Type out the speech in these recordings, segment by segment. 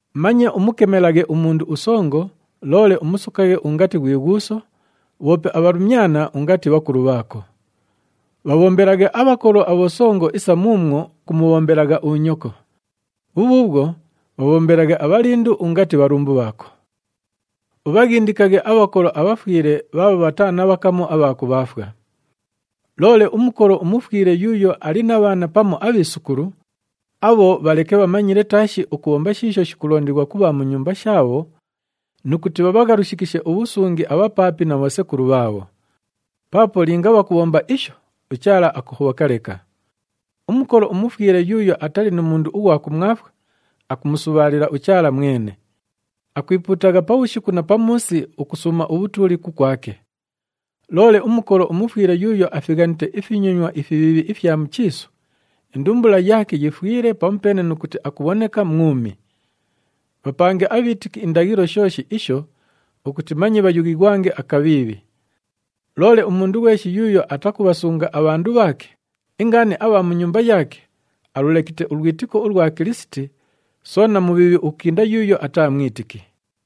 Manye umukemelaghe umundu usongo, loole umusokaghe ungati ghwi ghuuso, bhoope abhalumyana ungati bhakulu bhaako. Bhabhombelaghe abhakolo abhosongo isa muumwo kumubhombelagha unyoko. Bhubhuubhwo bhabhombelaghe abhalindu ungati bhalumbu bhaako. Ubhaghindikaghe abhakolo abhafwile bhaabho bhataa na bhakamu abha kubhaafwa. Loole umukolo umufwile yuuyo ali na bhaana pamu abhiisukulu, abho bhaleke bhamanyile taashi ukubhomba shiisho shikulondighwa ku bha mu nyumba shaabho nu kuti bhabhaghalushikishe ubhusungi abhapaapi na bhosekulu bhaabho. Paapo linga bhakubhomba isho, uChaala akuhobhoka leka. Umukolo umufwile yuuyo atali nu mundu ughwa kumwafwa, akumusubhaalila uChaala mwene. Akwipuutagha pabhushiku na pamuusi ukusuuma ubhutuuli kukwake. Loole umukolo umufwile yuuyo afighanite ifinyonywa ifibhiibhi ifya mu chiisu, indumbula yaake yifwile pamupeene nu kuti akubhoneka mwumi. Bhapange abhiitiki indaghilo shooshi isho ukuti manye bhayughighwange akabhiibhi. Loole umundu ghweshi yuuyo atakubhasunga abhandu bhaake, ingaani abha mu nyumba yaake, alulekite ulwitiko ulwa Kilisiti, soona mubhiibhi ukukinda yuuyo ataa mwitiki.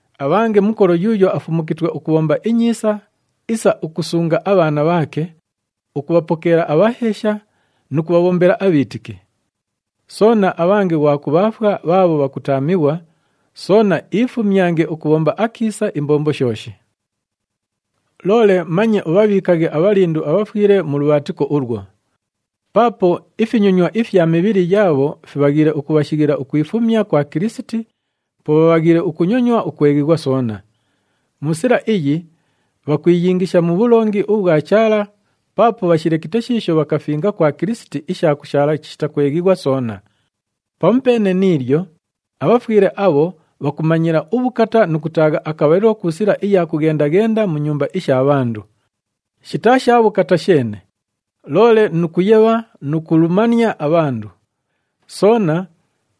Abhange mukolo yuuyo afumukitwe ukubhomba inyiisa isa ukusunga abhaana bhaake, ukubhapokeela abhaheesha nu kubhabhombela abhiitiki. Soona abhange ghwa kubhaafwa bhaabho bhakutaamighwa, soona iifumyange ukubhomba akiisa imbombo shooshi. Loole manye ubhabhiikaghe abhalindu abhafwile mu lubhaatiko ulwo. Paapo ifinyonywa ifya mibhili yaabho fibhaghiile ukubhashighila ukwifumya kwa Kilisiti, po bhabhaghiile ukunyonywa ukweghighwa soona. Mu sila iyi, bhakwiyingisha mu bhulongi ubhwa Chaala paapo bhashilekite shiisho bhakafinga kwa Kilisiti isha kushaala chishita kweghighwa soona. Pamupeene ni ilyo, abhafwile abho bhakumanyila ubhukata nu kutaagha akabhalilo ku sila iya kughenda-ghenda mu nyumba isha bhandu. Shitaa sha bhukata sheene, loole nu kuyebha nu kulumania abhandu. Soona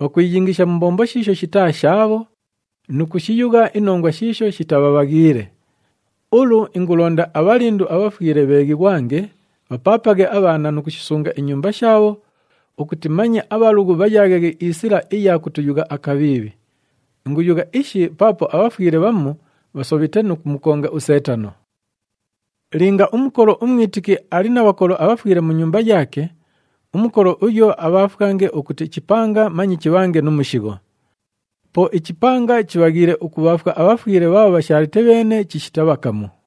bhakwiyingisha mu mbombo shiisho shitaa shaabho nu kushiyugha inongwa shiisho shitabhabhaghiile. Ulu, ingulonda abhalindu abhafwile bheeghighwange, bhapaapaghe abhaana nu kushisunga inyumba shaabho ukuti manye abhalughu bhayaaghaghe isila iya kutuyugha akabhiibhi. Inguyugha ishi paapo abhafwile bhamu bhasobhite nu kumukonga uSeetano. Linga umukolo umwitiki ali na bhakolo abhafwile mu nyumba yaake, umukolo uyo abhaafwange ukuti ichipanga manye chibhange nu mushigho. Po ichipanga chibhaghiile ukubhaafwa abhafwile bhaabho bhashaalite bheene chishita bhakamu.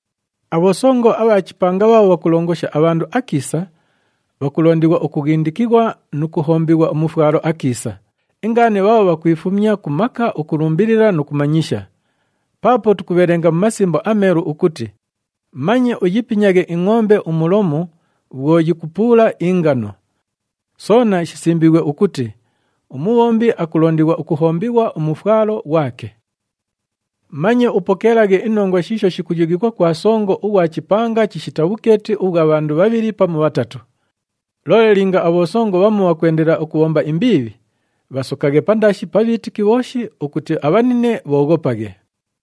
Abhosongo abha chipanga bhaabho bhakulongosha abhandu akiisa, bhakulondighwa ukughindikighwa nu kuhombighwa umufwalo akiisa, ingaani bhaabho bhakwifumya ku maka ukulumbilila nu kumanyisha. Paapo tukubhelenga mu Masimbo aMeelu ukuti, “Manye uyipinyaghe ingʼombe umulomu bhwo yikupuula ingano.” Soona shisimbiighwe ukuti, “Umubhombi akulondighwa ukuhombighwa umufwalo ghwake.” Manye upokeelaghe inongwa shiisho shikuyughighwa kwa songo ughwa chipanga chishita bhukeeti ubhwa bhandu bhabhili pamu bhatatu. Loole linga abhosongo bhamu bhakwendelela ukubhomba imbiibhi, bhasokaghe pandaashi pa bhiitiki bhooshi ukuti abhanine bhooghopaghe.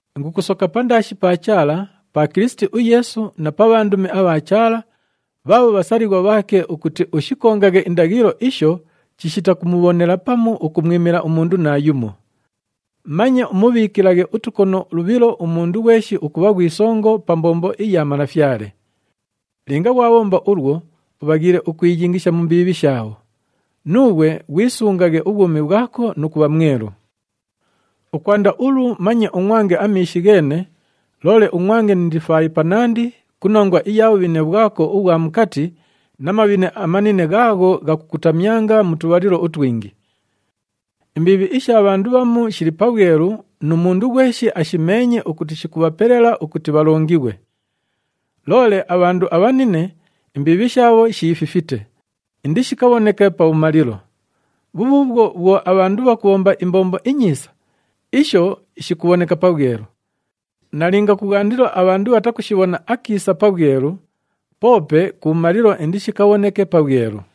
Ingukusoka pandaashi pa Chaala, pa Kilisiti uYeesu na pa bhandumi abha Chaala, bhaabho bhasalighwa bhaake ukuti ushikongaghe indaghilo isho chishita kumubhonela pamu ukumwimila umundu naayumo. Manye umubhiikilaghe utukono lubhilo umundu ghweshi ukubha ghwi songo pa mbombo iya Malafyale. Linga ghwabhomba ulwo, ubhaghiile ukwiyingisha mu mbiibhi shaabho. Nuughwe ghwisungaghe ubhwumi bhwako nu kubha mwelu. Ukwanda ulu manye ungʼwange amiishi gheene, loole ungʼwange ni ndifaayi panandi ku nongwa iya bhubhine bhwako ubhwa mukati na mabhine amanine ghaagho ghakukutamyanga mu tubhalilo utwingi. Imbiibhi isha bhandu bhamu shili pabhwelu nu mundu ghweshi ashimeenye ukuti shikubhapelela ukuti bhalongighwe. Loole abhandu abhanine, imbiibhi shaabho shiififite, indishikabhoneke pabhumalilo. Bhubhuubhwo, bhwo abhandu bhakubhomba imbombo inyiisa, isho shikubhoneka pabhwelu. Nalinga kubhwandilo abhandu bhatakushibhona akiisa pabhwelu, poope kubhumalilo indishikabhoneke pabhwelu.